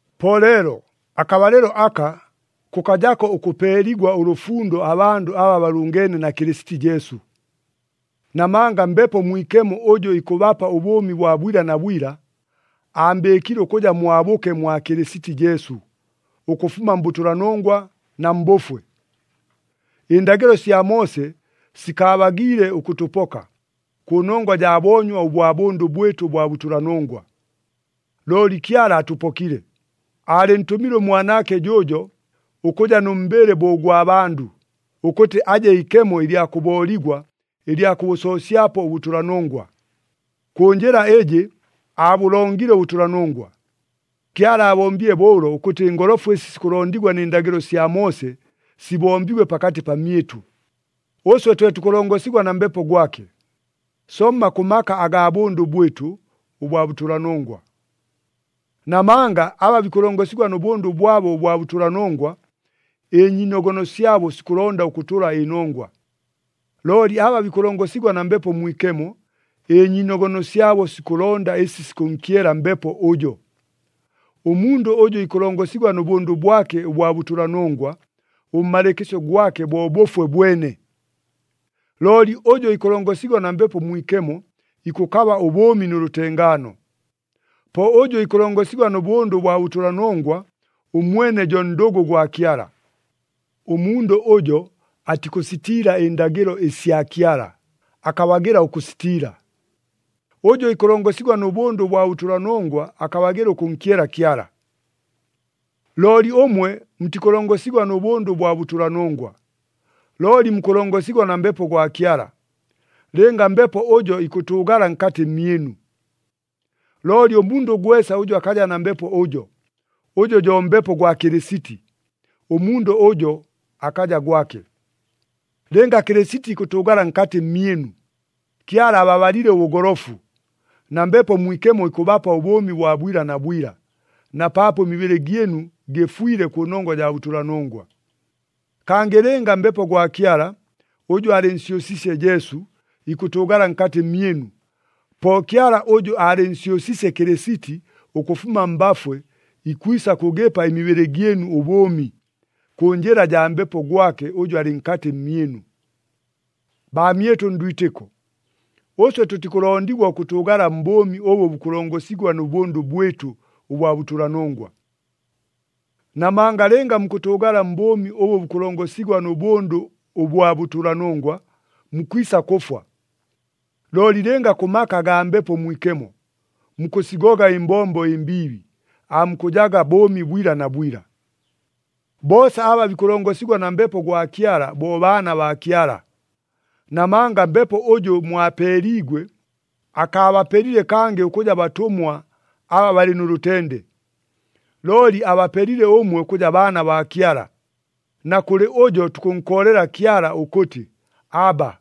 Po leelo, akabalɨlo aka, kʉkajako ʉkʉpeeligwa ʉlʉfundo abandʉ aba balʉngeene na Kɨlɨsiti Jesu. Namanga Mbepo Mwikemo ʉjʉ ikʉbapa ʉbʉʉmi bwa bwila na bwila, aambɨɨkile ʉkʉja mwabʉke mwa Kɨlɨsiti Jesu, ʉkʉfuma mbʉtʉlanongwa na mbʉfwe. Ɨndagɨlo sya Moose sikaabagiile ʉkʉtʉpoka, kʉnongwa jaa boonywa ʉbwa bʉndʉ bwɨtʉ ʉbwa bʉtʉlanongwa. Looli Kyala atʉpokile. Aalɨntʉmile ʉMwanaake jʉʉjo, ʉkʉja nʉ mbɨlɨ bo ʉgwa bandʉ, ʉkʉtɨ aje ikemo ɨlya kʉbooligwa ɨlya kʉbʉsoosyapo ʉbʉtʉlanongwa. Kʉ njɨla ɨjɨ aabʉlongile ʉbʉtʉlanongwa. Kyala aabombile bo ʉlo ʉkʉtɨ ɨngolofu ɨsi sikʉlondigwa nɨ ndagɨlo sya Moose sibombigwe pakatɨ pamyɨtʉ, ʉswe twe tukʉlongosigwa na Mbepo gwake, somma kʉ maka agaa bʉndʉ bwɨtʉ ʉbwa bʉtʉlanongwa. Namanga aba bikʉlongosigwa nʉ bʉndʉ bwabo ʉbwa bʉtʉlanongwa, ɨnyiinogono syabo sikʉlonda ʉkʉtʉla ɨnongwa. Looli aba bikʉlongosigwa na Mbepo Mwikemo, ɨnyiinogono syabo sikʉlonda ɨsi sikʉnkyela Mbepo ʉjo. Ʉmundʉ ʉjʉ ikʉlongosigwa nʉ bʉndʉ bwake ʉbwa bʉtʉlanongwa, ʉmmalɨɨkɨsyo gwake bo bʉfwe bwene. Looli ʉjʉ ikʉlongosigwa na Mbepo Mwikemo, ikʉkaba ʉbʉʉmi nʉ lʉtengaano. Po ʉjʉ ikʉlongosigwa nʉ bʉndʉ ʉbwa bʉtʉlanongwa, ʉmwene jo ndʉgʉ gwa Kyala. Ʉmundʉ ʉjo atikʉsitiila ɨndagɨlo ɨsya Kyala, akabagɨla ʉkʉsitiila. Ʉjʉ ikʉlongosigwa nʉ bʉndʉ ʉbwa bʉtʉlanongwa akabagɨla ʉkʉnkyela Kyala. Looli ʉmwe mutikʉlongosigwa nʉ bʉndʉ ʉbwa bʉtʉlanongwa, looli mukʉlongosigwa na Mbepo gwa Kyala, lɨnga Mbepo ʉjo ikʉtʉʉgala nkatɨ mmyɨnu. Looli ʉmundʉ gwesa ʉjʉ akaja na Mbepo ʉjo, ʉjʉ jo Mbepo gwa Kɨlɨsiti, ʉmundʉ ʉjo akaja gwake. Lɨnga Kɨlɨsiti ikʉtʉʉgala nkatɨ mmyɨnu, Kyala ababalile ʉbʉgolofu, na Mbepo Mwikemo ikʉbapa ʉbʉʉmi bwa bwila na bwila, na paapo ɨmibɨlɨ gyɨnu gɨfwile kʉnongwa jaa bʉtʉlanongwa. Kangɨ lɨnga Mbepo gwa Kyala, ʉjʉ aalɨnsyʉsiisye Jesu, ikʉtʉʉgala nkatɨ mmyɨnu, po Kyala ʉjʉ aalɨnsyʉsiisye Kɨlɨsiti ʉkʉfuma mbafwe ikwisa kʉgɨpa ɨmibɨlɨ gyɨnu ʉbʉʉmi, kʉ njɨla jaa Mbepo gwake ʉjʉ alɨ nkatɨ mmyɨnu. Baamyɨtʉ ndwitɨko, ʉswe tʉtikʉlondigwa ʉkʉtʉʉgala mbʉʉmi ʉbʉ bukʉlongosigwa nʉ bʉndʉ bwɨtʉ ʉbwa bʉtʉlanongwa. Namanga lɨnga mukʉtʉʉgala mbʉʉmi ʉbʉ bukʉlongosigwa nʉ bʉndʉ ʉbwa bʉtʉlanongwa, mukwisa kʉfwa. Looli lɨnga kʉ maka agaa Mbepo Mwikemo, mukʉsigoga ɨmbombo ɨmbiibi, aamukʉjaga bʉʉmi bwila na bwila. Boosa aba bikʉlongosigwa na Mbepo gwa Kyala bo baana baa Kyala. Namanga Mbepo ʉjʉ mwapeeliigwe, akaabapelile kangɨ ʉkʉja batʉmwa aba balɨ nʉ lʉtende. Looli abapelile ʉmwe ʉkʉja baana baa Kyala, na kʉlɨ ʉjo tukʉnkoolela Kyala ʉkʉtɨ, “Abba,”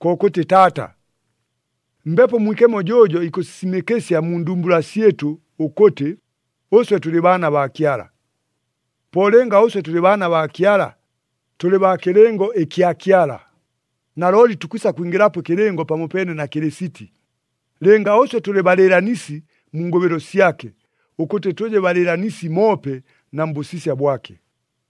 kokʉtɨ, “Taata.” Mbepo Mwikemo jʉʉjo ikʉsisimɨkɨsya mu ndumbula syɨtʉ ʉkʉtɨ, ʉswe tʉlɨ baana baa Kyala. Po lɨnga ʉswe tʉlɨ baana baa Kyala, tʉlɨ baa kɨlɨngo ɨkya Kyala. Nalooli tukwisa kwingɨlapo ɨkɨlɨngo pamopeene na Kɨlɨsiti, lɨnga ʉswe tʉlɨ balɨɨlanisi mu ngʉbɨlo syake, ʉkʉtɨ tʉje balɨɨlanisi moope na mbʉsisya bwake.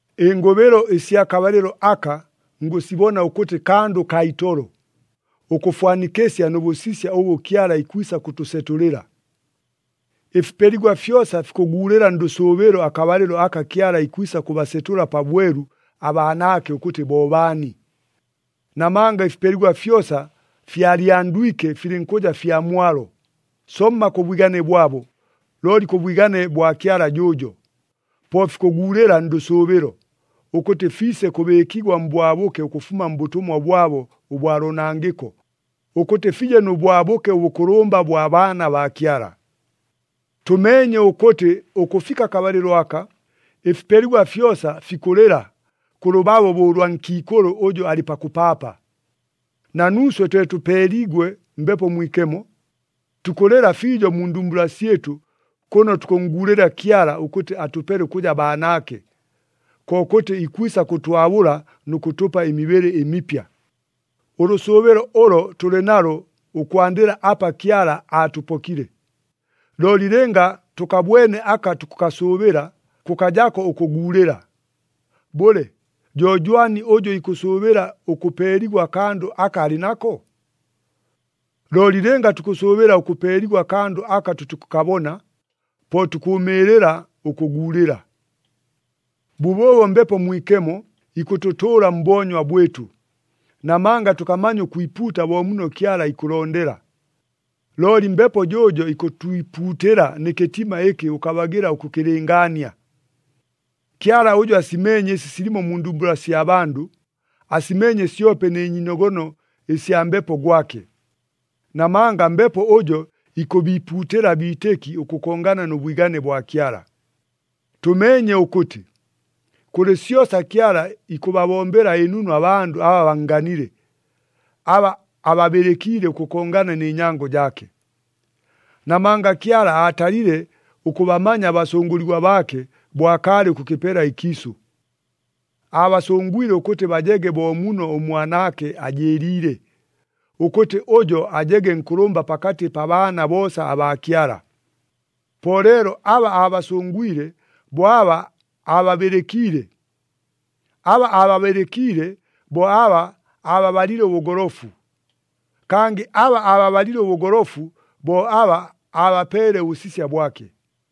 Ɨngʉbɨlo ɨsya kabalɨlo aka ngʉsibona ʉkʉtɨ kandʉ kaa itolo, ʉkʉfwanikɨsya nʉ bʉsisya ʉbʉ Kyala ikwisa kʉtʉsetʉlɨla. Ɨfipeligwa fyosa fikʉguulɨla ndʉsʉʉbɨlo akabalɨlo aka Kyala ikwisa kʉbasetʉla pabwelu abaanaake ʉkʉtɨ bo baani. Namanga ɨfipeligwa fyosa fyalyandwike filɨnkʉja fya mwalo, somma kʉ bwigane bwabo, looli kʉ bwigane bwa Kyala jʉʉjo. Po fikʉguulɨla ndʉsʉʉbɨlo, ʉkʉtɨ fiise kʉbɨɨkigwa mbwabʉke ʉkʉfuma mbʉtʉmwa bwabo ʉbwa loonangɨko, ʉkʉtɨ fije nʉ bwabʉke ʉbʉkʉlʉmba bwa baana baa Kyala. Tʉmeenye ʉkʉtɨ ʉkʉfika akabalɨlo aka, ɨfipeligwa fyosa fikʉlɨla kʉ lʉbabo bo ʉlwa nkiikʉlʉ ʉjʉ alɨ pakʉpaapa. Na nuuswe, twe tʉpeeliigwe Mbepo Mwikemo, tukʉlɨla fiijo mu ndumbula syɨtʉ kʉno tukʉnnguulɨla Kyala ʉkʉtɨ atʉpele ʉkʉja baanaake, kokʉtɨ ikwisa kʉtwabʉla nʉ kʉtʉpa ɨmibɨlɨ ɨmipya. Ʉlʉsʉʉbɨlo ʉlo tʉlɨ nalo ʉkwandɨla apa Kyala aatʉpokile. Looli lɨnga tʉkabwene aka tukʉkasʉʉbɨla, kʉkajako ʉkʉguulɨla. Bʉle, jo jwani ʉjʉ ikʉsʉʉbɨla ʉkʉpeeligwa akandʉ aka alɨ nako? Looli lɨnga tukʉsʉʉbɨla ʉkʉpeeligwa akandʉ aka tʉtikʉkabona, po tukʉʉmɨɨlɨla ʉkʉguulɨla. Bʉbʉʉbo Mbepo Mwikemo ikʉtʉtʉʉla mboonywa bwɨtʉ. Namanga tʉkamanya ʉkwipuuta bo muno Kyala ikʉlondela, looli Mbepo jʉʉjo ikʉtwipuutɨla nɨ kɨtima ɨkɨ ʉkabagɨla ʉkʉkɨlɨngaania. Kyala ʉjʉ asimeenye ɨsi silimo mu ndumbula sya bandʉ, asimeenye syope nɨ nyiinogono ɨsya Mbepo gwake. Namanga Mbepo ʉjo ikʉbiipuutɨla abiitɨki ʉkʉkongana nʉ bwigane bwa Kyala. Tʉmeenye ʉkʉtɨ, kʉlɨ syosa Kyala ikʉbabombela ɨnunu abandʉ aba bannganile, aba ababɨlɨkiile ʉkʉkongana nɨ nyango jaake. Namanga Kyala aatalile ʉkʉbamanya abasʉngʉligwa baake bo akaalɨ ʉkʉkɨpela ɨkiisʉ. Aabasʉngwile ʉkʉtɨ bajege bo muno ʉMwanaake ajɨɨliile, ʉkʉtɨ ʉjo ajege nkʉlʉmba pakatɨ pa baana boosa abaa Kyala. Po leelo aba aabasʉngwile, bo aba aababɨlɨkiile. Aba aababɨlɨkiile, bo aba aababalile ʉbʉgolofu. Kangɨ aba aababalile ʉbʉgolofu, bo aba aabapeele ʉbʉsisya bwake.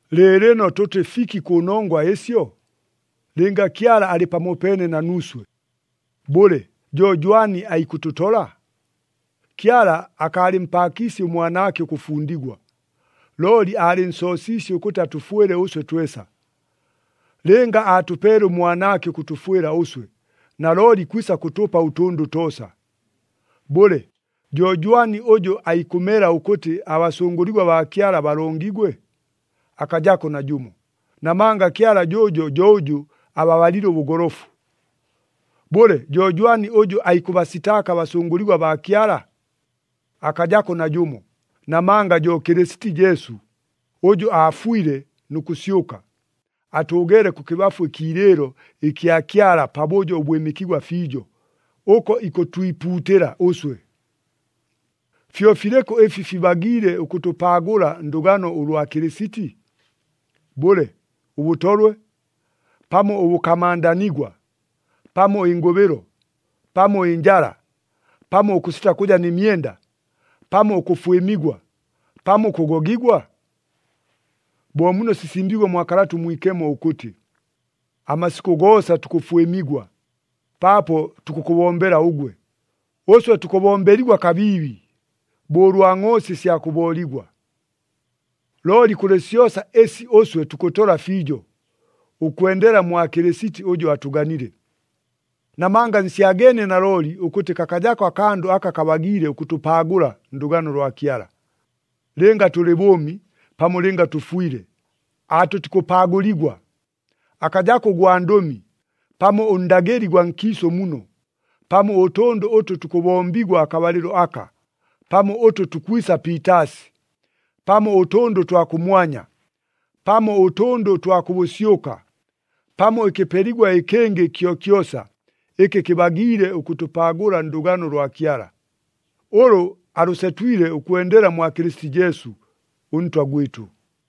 Lɨɨlɨno tʉtɨ fiki kʉ nongwa ɨsyo? Lɨnga Kyala alɨ pamopeene na nuuswe, bʉle, jo jwani aikʉtʉtola? Kyala akaalɨmpaakiisye ʉMwanaake ʉkʉfundigwa, looli aalɨnsoosiisye ʉkʉtɨ atʉfwɨle ʉswe twesa. Lɨnga aatʉpeele ʉMwanaake ʉkʉtʉfwɨla ʉswe, nalooli ikwisa kʉtʉpa ʉtʉndʉ toosa. Bʉle, jo jwani ʉjʉ aikʉmela ʉkʉtɨ abasʉngʉligwa baa Kyala balongigwe? Akajako najʉmo, namanga Kyala jʉʉjo jo ʉjʉ ababalile ʉbʉgolofu. Bʉle, jo jwani ʉjʉ aikʉbasitaaka abasʉngʉligwa baa Kyala? Akajako najʉmo, namanga jo Kɨlɨsiti Jesu, ʉjʉ aafwile nʉ kʉsyʉka, atʉʉgeele kʉkɨbafu ɨkiilɨɨlo ɨkya Kyala pabʉjo ʉbwɨmɨkigwa fiijo, ʉko ikʉtwipuutɨla ʉswe. Fyo filɨkʉ ɨfi fibagiile ʉkʉtʉpaagʉla ndʉgano ʉlwa Kɨlɨsiti? Bʉle, ʉbʉtolwe, pamo ʉbʉkamandanigwa, pamo ɨngʉbɨlo, pamo ɨnjala, pamo ʉkʉsita kʉja nɨ myenda, pamo ʉkʉfwɨmigwa, pamo ʉkʉgogigwa? Bo muno sisimbiigwe mwa Kalata ʉMwikemo ʉkʉtɨ, “Amasikʉ goosa tukʉfwɨmigwa, paapo tukʉkʉbombela ʉgwe. Ʉswe tukʉbombeligwa kabiibi, bo ʉlwa ngʼoosi ɨsya kʉbooligwa.” Looli kʉlɨ syosa ɨsi ʉswe tukʉtola fiijo, ʉkwendela mwa Kɨlɨsiti ʉjʉ atʉganile. Namanga nsyageenie nalooli ʉkʉtɨ kakajako akandʉ aka kabagiile ʉkʉtʉpaagʉla ndʉgano lwa Kyala. Lɨnga tʉlɨ bʉʉmi, pamo lɨnga tʉfwile, aatʉtikʉpaagʉligwa. Akajako ʉgwandʉmi, pamo ʉndagɨli gwa nkiisʉ muno, pamo ʉtʉndʉ ʉtʉ tukʉbombigwa akabalɨlo aka, pamo ʉtʉ tukwisa piitaasi, pamo ʉtʉndʉ ʉtwa kʉmwanya, pamo ʉtʉndʉ ʉtwa kʉ bʉsyʉka, pamo ɨkɨpeligwa ɨkɨngɨ kyokyosa ɨkɨ kɨbagiile ʉkʉtʉpaagʉla ndʉgano lwa Kyala, ʉlʉ alʉsetwile ʉkwendela mwa Kɨlɨsiti Jesu, ʉNtwa gwɨtʉ.